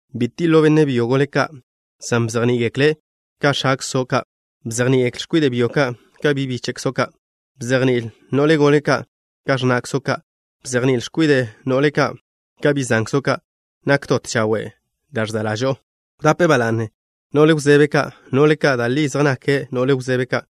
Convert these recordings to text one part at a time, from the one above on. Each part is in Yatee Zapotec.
Bi tiḻo' benne' byo gole ka', san bzejní'i-gekle' ka x̱akzo' ka'. Bzejní'il x̱kwide' byo ka' ka bi' bíche'kzo' ka'. Bzejní'il no'le gole ka' ka x̱na'kzo' ka'. Bzejní'il x̱kwide' no'le ka' ka bi' zankzo' ka', nak dot chawe' da' ẕza' ḻažo'o. Wdape ba la'ne no'le wzebe ka', no'le ka' da' li zej nake' no'le wzebe ka'.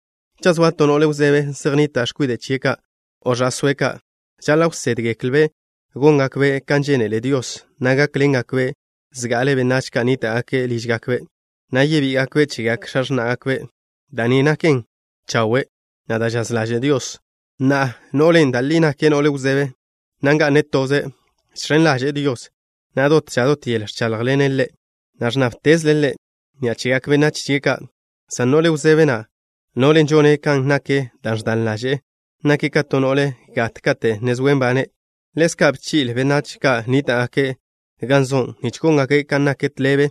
Cha' zoa to no'le wzebe zej nnita' x̱kwide' chie' ka', o ẕa'sóe' ka', žaḻa' wsédgeklbe' góngakbe' kan žénele Dios, na' gákḻengakbe' zga'ale benách ka' nníta'gake' lížgakbe' ka', na' yebí'igakbe' chegak x̱a x̱ná'gakbe'. Da' ni naken chawe', na' da' žaz ḻaže' Dios. Na'a, no'len' da' li nake' no'le wzebe, na' nga'ne' toze', žx̱en ḻaže'e Dios, na' dot ža dot yel ẕcháḻjḻene' Ḻe', na' ẕnnábtezle' Ḻe' ni'a chegak benách chie' ka', san no'le wzebe na', no'len' žone' kan nak da' ẕdan ḻaže'e, nake' ka to no'le gat kate' ne zoe' nbane'. Ḻezka', bchi'le benách ka' nníta'gake' gan zo', nich góngake' kan nak tḻebe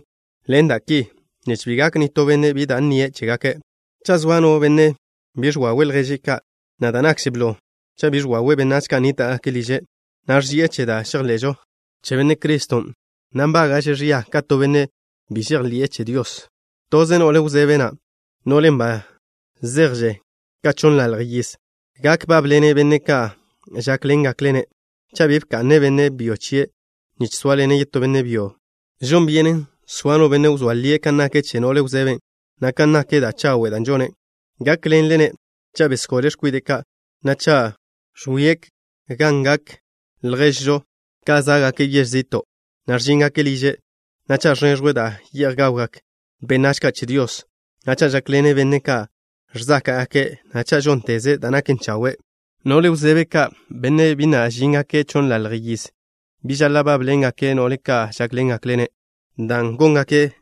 ḻen da' ki, nich bi gak nitó benne' bi da' nnie' chégake'. Cha' zoa no benne' bi ẕwawe' lježe' ka', na' da' nakže blo, cha' bi ẕwawe' benách ka' nníta'gake' liže', na' ẕži'e che da' žejḻe'žo che Benne' Criston', na' nbága'že' ẕia ka to benne' bi žejḻi'e che Dios. Toze no'le wzebe na', no'len' ba zejže' ka chonnlalj yiz, gak bábḻene' benne' ka' žákḻengakle-ne', cha' bi bka'ne' benne' byo chie' nich sóaḻene' yetó benne' byo. Žon byenen soa no benne' wzóa lie' kan nak che no'le wzebe na' kan nak da' chawe' da' žone'. Gákḻenle-ne' cha' besgole' x̱kwide' ka', na' cha' ẕwi'e gan ga'ngak lježžo ka' zá'gake' yež zi'to', na' ẕžíngake' liže', na' cha' ẕneẕjwe' da' ye'j gawgak benách ka' che Dios, na' cha' žákḻene' benne' ka' ẕzáka'gake', na' cha' žónteze' da' naken chawe'. No'le wzebe ka' bi na' zéjgake' chonnlalj yiz, bi žaḻa' bábḻengake' no'le ka' žákḻengakle-ne', dan' góngake'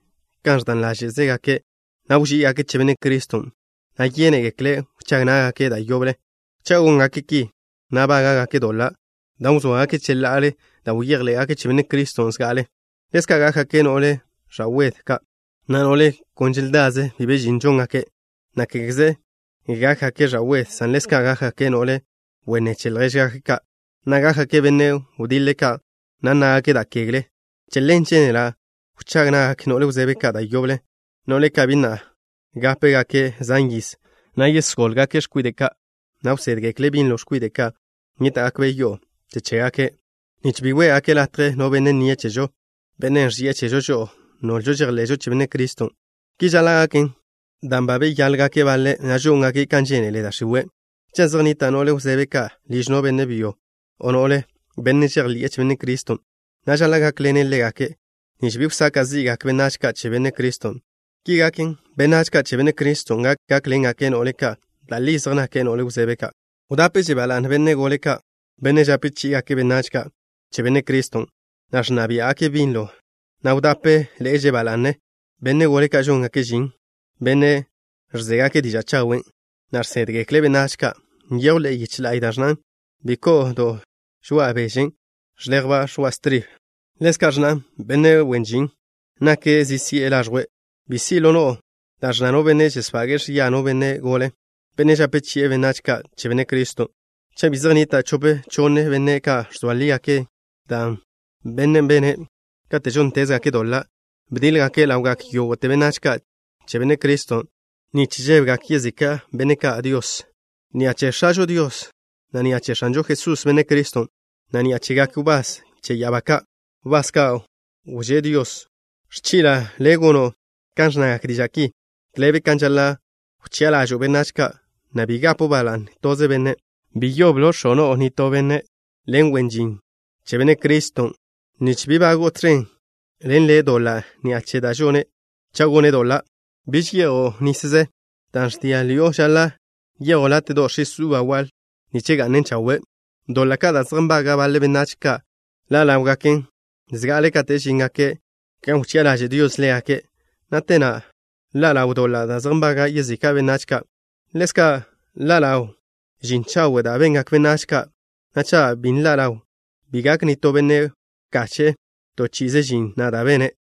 kan ẕdan ḻáže'zegake', na' wží'igake' che Benne' Criston', na' yénegekle' wchág ná'gake' da' yoble. Cha' góngake' ki, na' bága'gake' doḻa' dan' wzóagake' cheḻa'ale da' bejḻé'gake' che Benne' Criston' zga'ale. Ḻezka' gákgake' no'le ẕa'wed ka', na' no'le kon želdaze' bi be žin žóngake', na' kégeze gákgake' ẕa'wed, san ḻezka' gákgake' no'le wenné che ljéžgake' ka', na' gákgake' benne' wediḻe ka', na' nnágake' da' kegle. Che ḻen, žénela' wchág na'gak no'le wzebe ka' da' yoble, no'le ka' bi nápegake' zan yiz, na' yesgólgake' x̱kwide' ka', na' wsédgekle' binlo x̱kwide' ka' nníta'gakbe' yo'o che chégake', nich bi wé'gake' latje no benne' nnie' chežo, bennen' ẕži'e chežo žo'o, nolžo žejḻe'žo che Benne' Criston'. Ki žaḻa' gaken, dan' ba beyálgake' baḻe', na' žóngake' kan žénele da' x̱iwe'. Cha' zej nnita' no'le wzebe ka' liž no benne' byo o no no'le, benne' žejḻi'e che Benne' Criston', na' žaḻa' gákḻene' ḻégake', nich bi wsaka' zí'gake' benách ka' che Benne' Criston'. Ki gaken, benách ka' che Benne' Criston' gak gákḻengake' no'le ka' da' li zej nake' no'le wzebe ka'. Wdápeže ba la'ne benne' gole' ka', benne' žape chí'igake' benách ka' che Benne' Criston', na' ẕnna biá'gake' binlo, na' wdápeḻe'eže ba la'ne benne' gole ka' žóngake' žin, benne' ẕzégake' diža' chawen', na' žsédgekle' benách ka'. Nyejw ḻe'e yiche la'y da' ẕnnan: “Bi ko'o do žoa' bežen' ẕḻejba' ẕoa' stribe.” Ḻezka' ẕnnan: “Benne' wen žin nake' zi si'e laẕjwe'.” Bi si' ḻo no'o da' ẕnna no benne' žesbage'e ẕia no benne' gole, benne' žape chi'e benách ka' che Benne' Criston', cha' bi zej nnita' chope chonne benne' ka' ẕzoa lígake' dan' bene'. Benne' ka' žóntezgake' doḻa', bdiḻ-gake' ḻawgak yógo'te benách ka' che Benne' Criston' nich žébegak yezika' benne' ka' Dios. Ni'a che X̱ažo Dios, na' ni'a che X̱anžo Jesús, Benne' Criston', na' ni'a chegak wbás che ya'abá ka', wbás ka' wžé Dios, ẕchi'la' le' gono' kan ẕnnagak diža' ki. Tḻebe kan žaḻa' wchi'a ḻažo'o benách ka', na' bi gapo' ba la'ne toze benne'. Bi wx̱oate no'o nitó benne', bi gono' ḻe' wen žin che Benne' Criston', nich bi bago'o tẕen ḻen ḻe' doḻa' ni'a che da' žone' cha' gone' doḻa'. Biž ye'jo' nisze. Dan' ẕdia' ḻi'o žaḻa' ye'jo' láte'do' x̱is uba waḻ nich ga'nen chawe'. Doḻa' ka' da' zej nbaga' baḻe benách ka' ḻa' ḻáwgaken zga'ale kate' žíngake' gan wchi'a ḻaže' Dios ḻégake', na' te na' ḻa' ḻaw doḻa' da' zej nbaga' yezika' benách ka'. Ḻezka', ḻa' ḻaw žin chawe' da' bengak benách ka', na' cha' bi nḻa' ḻawn, bi gak nitó benne' wkache'e to chi'ize žin na' da' bene'.